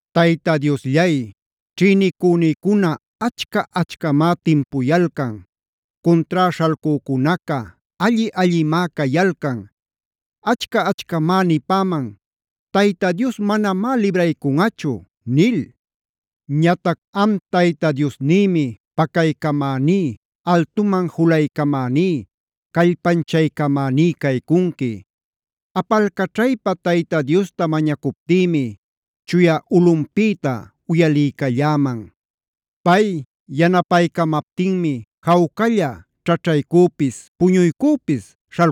¡Tayta Diosllay, ćhïnicünïcuna achca-achcamá timpuyalcan. Cuntrá śhalcücunaca alli-allimá cayalcan! Achca-achcamá nipäman: “Tayta Dios manamá libraycunꞌachu” nil. Ñatac am Tayta Diosnïmi pacaycamäní, altuman julaycamäní, callpanchaycamäní caycunqui. Apalcaćhaypa Tayta Diosta mañacuptïmi chuya ulꞌunpïta uyaliycalläman. Pay yanapaycamaptinmi jawcalla ćhaćhaycüpis, puñuycüpis,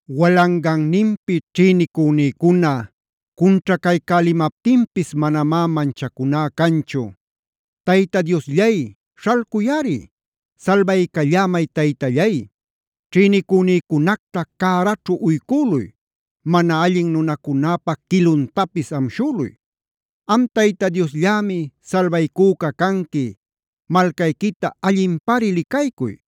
Walanganninpi ćhïnicünïcuna cunćhacaycälimaptinpis manamá manchacuná canchu. ¡Tayta Diosllay, śhalcuyꞌari! ¡Salbaycallämay, Taytallay! Ćhïnicünïcunacta cäraćhu uycüluy. Mana allin nunacunäpa quiluntapis amshüluy. Am Tayta Diosllämi salbaycüca canqui. ¡Malcayquita allinpari licaycuy!